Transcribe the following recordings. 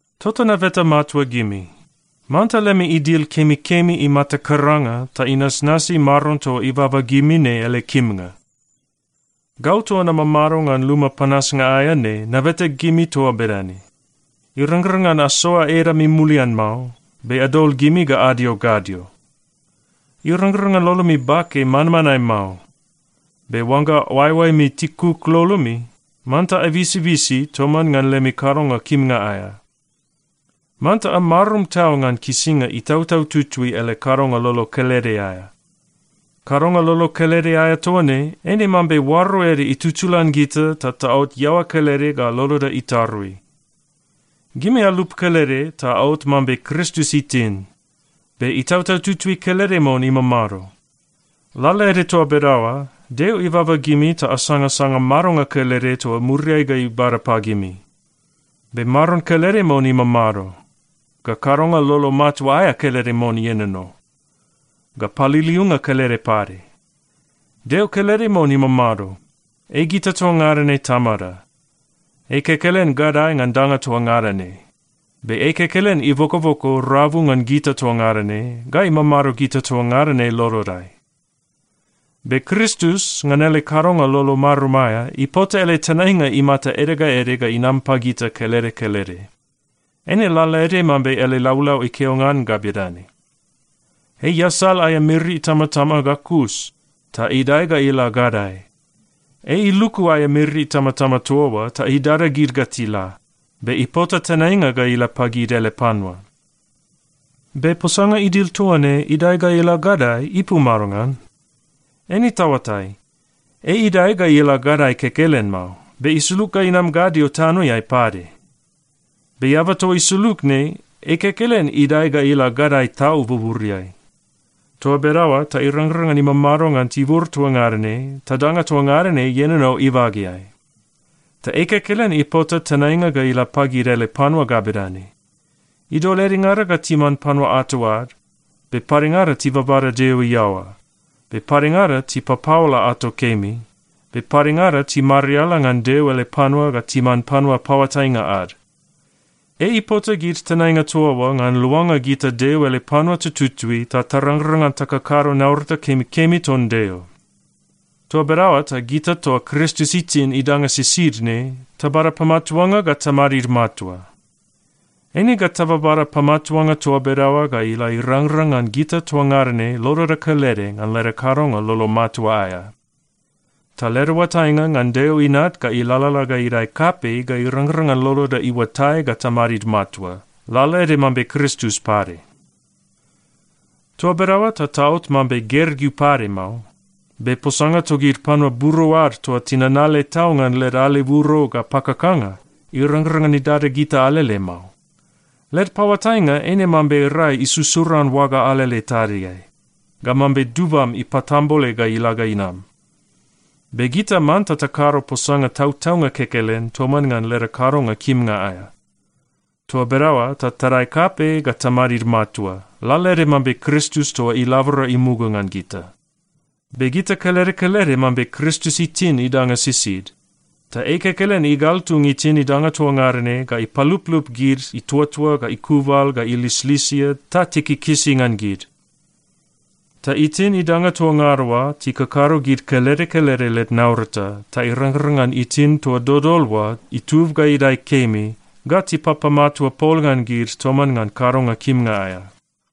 Tota nabeta matua gimi, manta lemi idil kemikemi imata karanga ta inasnasi Maron toa ibaba gimi ne ele kimnga. Gau toa namamado ngan luma panasnga aea ne nabeta gimi toa bedane. Irangrang ngan asoa edami mulian mao, be adol gimi ga adio gadio. Irangrang ngan lolomi bake manmanae mao, be oangga oaeoaemi tikuk lolomi, manta abisibisi toman ngan lemi kadonga kimnga aea. Manta amarum tau ngan kisinga Itautau Tutui ele kadonga lolo kelede aea. Kadonga lolo kelede aea toa ne, eine mambe oaro ede itutulan gita ta taot iaoa kelede ga loloda itarui. Gimi alup kelede ta aot mambe Kristus itin. Be Itautau Tutui kelede mon imamado. Lalaede toa bedaoa, Deo ibaba gimi ta asangasanga madonga kelede toa muriai ga ibada pagimi. Be Maron kelede mon imamado, ga kadonga lolo matua aea kelede mon ienono, ga paliliunga kelede pade. Deo kelede mon imamado. Ei gita toa ngada ne Tamada. Ei kekelen gadae ngan danga toa ngada ne, be ei kekelen ibokoboko rabu ngan gita toa ngada ne, ga imamado gita toa ngada ne lolodai. Be Kristus, ngan ele kadonga lolo marum aea, ipota ele tenainga imata ede ga ede ga inam pagita kelede kelede. Eine lalaede mambe ele laulau ikeo ngan ga bedane, “Ei iasal aea miri itamatama ga kus, ta idae ga ila gadae. Ei iluku aea miri itamatama toa oa ta idada gid ga tila. Be ipota tenainga ga ila pagid ele panua.” Be posanga idil toa ne, “idae ga ila gadae,” ipu madongan? Eine taoatai, ei idae ga ila gadae kekelen mao, be isulug ga inam gadio tanoeai pade. Be eaba toa isulug ne, ei kekelen idae ga ila gadae tau buburiai. Toa bedaoa ta irangrang ngan imamado ngan tibur toa ngada ne ta danga toa ngada ne ienono ibageai. Ta ei kekelen ipota tenainga ga ila pagid ele panua ga bedane: Idol edengada ga timan panua ato ad, be padengada tibabada Deo iaoa, be padengada tipapaola ato kemi, be padengada timariala ngan Deo ele panua ga timan panua paoatainga ad. Ei ipota gid tenainga toa oa ngan luanga gita Deo ele panua tututui ta tarangrang ngan takakado naurata kemikemi ton Deo. Toa bedaoa ta gita toa Kristus itin idanga sisid ne tabada pamatuanga ga tamadid matua. Eine ga tababada pamatuanga toa bedaoa ga ila irangrang ngan gita toa ngada ne loloda kelede ngan leda kadonga lolo matua aea. Ta leda oatainga ngan Deo Inat ga ilalala ga idae kapei ga irangrang ngan loloda iuatai ga tamadid matua, lalaede mambe Kristus pade. Toa bedaoa ta taot mambe gergeu pade mao. Be posanga togid panua buro ad toa tinanale tau ngan led aleburo ga pakakanga, irangrang ngan idada gita alele mao. Led paoatainga eine mambe rai isusuran oaga alele tadiai ga mambe dubam ipatambole ga ila ga inam. Be gita manta takado posanga tautaunga kekelen toman ngan leda kadonga kimnga aea. Toa bedaoa ta tadae kapei ga tamadid matua, lalaede mambe Kristus toa ilabora imuga ngan gita. Be gita kelede kelede mambe Kristus itin idanga sisid. Ta ei kekelen igaltung itin idanga toa ngada ne ga ipaluplup gid ituatua ga ikubal ga ilislisia ta tikikisi ngan gid. Ta itin idanga toa ngada oa tikakado gid kelede kelede led naurata ta irangrang ngan itin toa dodol oa itub ga idae kemi ga tipapamatua pol ngan gid toman ngan kadonga kimnga aea.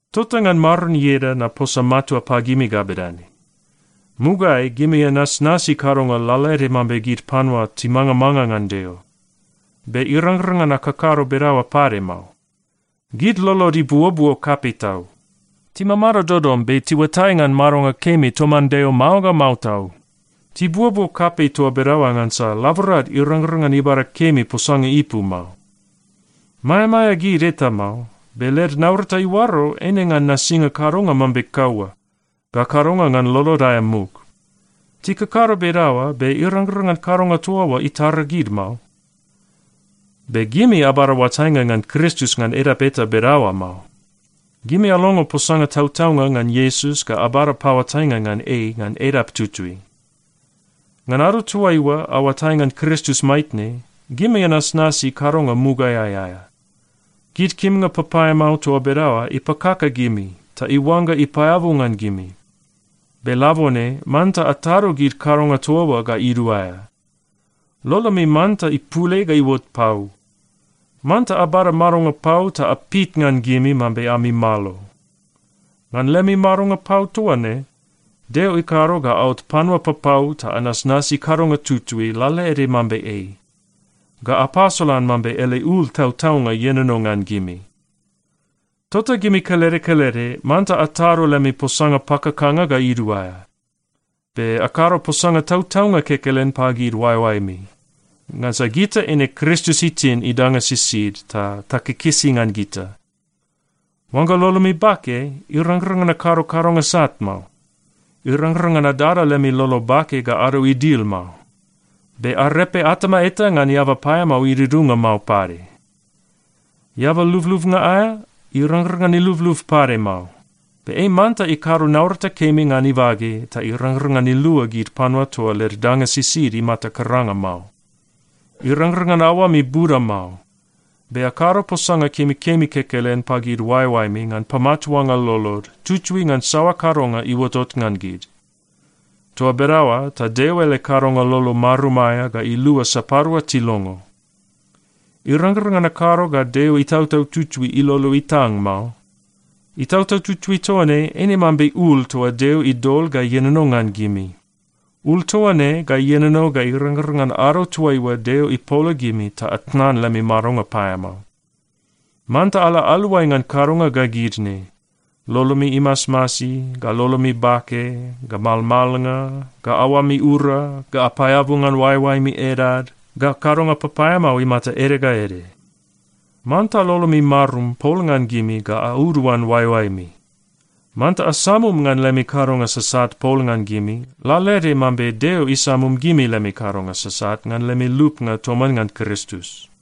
Tota ngan Maron ieda naposa matua pagimi ga bedane: Mugaeai gimi anasnasi kadonga lalaede mambe gid panua timangamanga ngan Deo, be irangrang ngan akakado bedaoa pade mao. Gid lolod ibuobuo kapei tau. Timamado dodom be tiuatai ngan madonga kemi toman Deo mao ga mao tau. Tibuobuo kapei toa bedaoa ngansa laborad irangrang ngan ibada kemi posanga ipu mao. Maeamaea gid eta mao, be led naurata iuaro eine ngan nasinga kadonga mambe kaua ga kadonga ngan lolod aea muk. Tikakado bedaoa, be irangrang ngan kadonga toa oa itara gid mao. Be gimi abada oatainga ngan Kristus ngan edap eta bedaoa mao. Gimi alongo posanga tautaunga ngan Iesus ga abada paoatainga ngan ei ngan edap tutui. Ngan ado toaiua aoatai ngan Kristus maitne, gimi anasnasi kadonga mugaeai aea. Gid kimnga papaeamao toa bedaoa ipakaka gimi ta iuangga ipaeabu ngan gimi. Be labone manta atado gid kadonga toa oa ga iduaea. Lolomi manta ipul ei ga iuot pau. Manta abada madonga pau ta apit ngan gimi mambe ami malo. Ngan lemi madonga pau toa ne, Deo ikado ga aot panua papau ta anasnasi kadonga tutui lalaede mambe ei, ga apasolan mambe ele ul tautaunga ienono ngan gimi. Tota gimi kelede kelede manta atado lemi posanga pakakanga ga iduaea. Be akado posanga tautaunga kekelen pagid oaeoaemi. Ngansa gita eine Kristus itin idanga sisid ta takikisi ngan gita. “Oangga lolomi bake, irangrang ngan akado kadonga sat mao.” Irangrang ngan adada lemi lolo bake ga ado idil mao. Be arepe atama eta ngan eaba paeamao idudunga mao pade. Eaba lublubnga aea, irangrang ngan ilublub pade mao. Be ei manta ikado naurata kemi ngan ibage ta irangrang ngan ilua gid panua toa led danga sisid imata karanga mao. Irangrang ngan aoami buda mao. Be akado posanga kemikemi kekelen pagid oaeoaemi ngan pamatuanga lolod, tutui ngan saoa kadonga iuotot ngan gid. Toa bedaoa ta Deo ele kadonga lolo marum aea ga ilua sapadua tilongo. Irangrang ngan akado ga Deo Itautau Tutui ilolo itang mao. Itautau Tutui toa ne eine mambe ul toa Deo idol ga ienono ngan gimi. Ul toa ne ga ienono ga irangrang ngan ado toaiua Deo ipola gimi ta atnan lemi madonga paeamao. Manta ala aluai ngan kadonga ga gid ne: lolomi imasmasi, ga lolomi bake, ga malmalnga, ga aoami ura, ga apaeabu ngan oaeoaemi edad, ga kadonga papaeamao imata ede ga ede. Manta lolomi marum pol ngan gimi ga auduan oaeoaemi. Manta asamum ngan lemi kadonga sasat pol ngan gimi, lalaede mambe Deo isamum gimi lemi kadonga sasat ngan lemi lupnga toman ngan Kristus.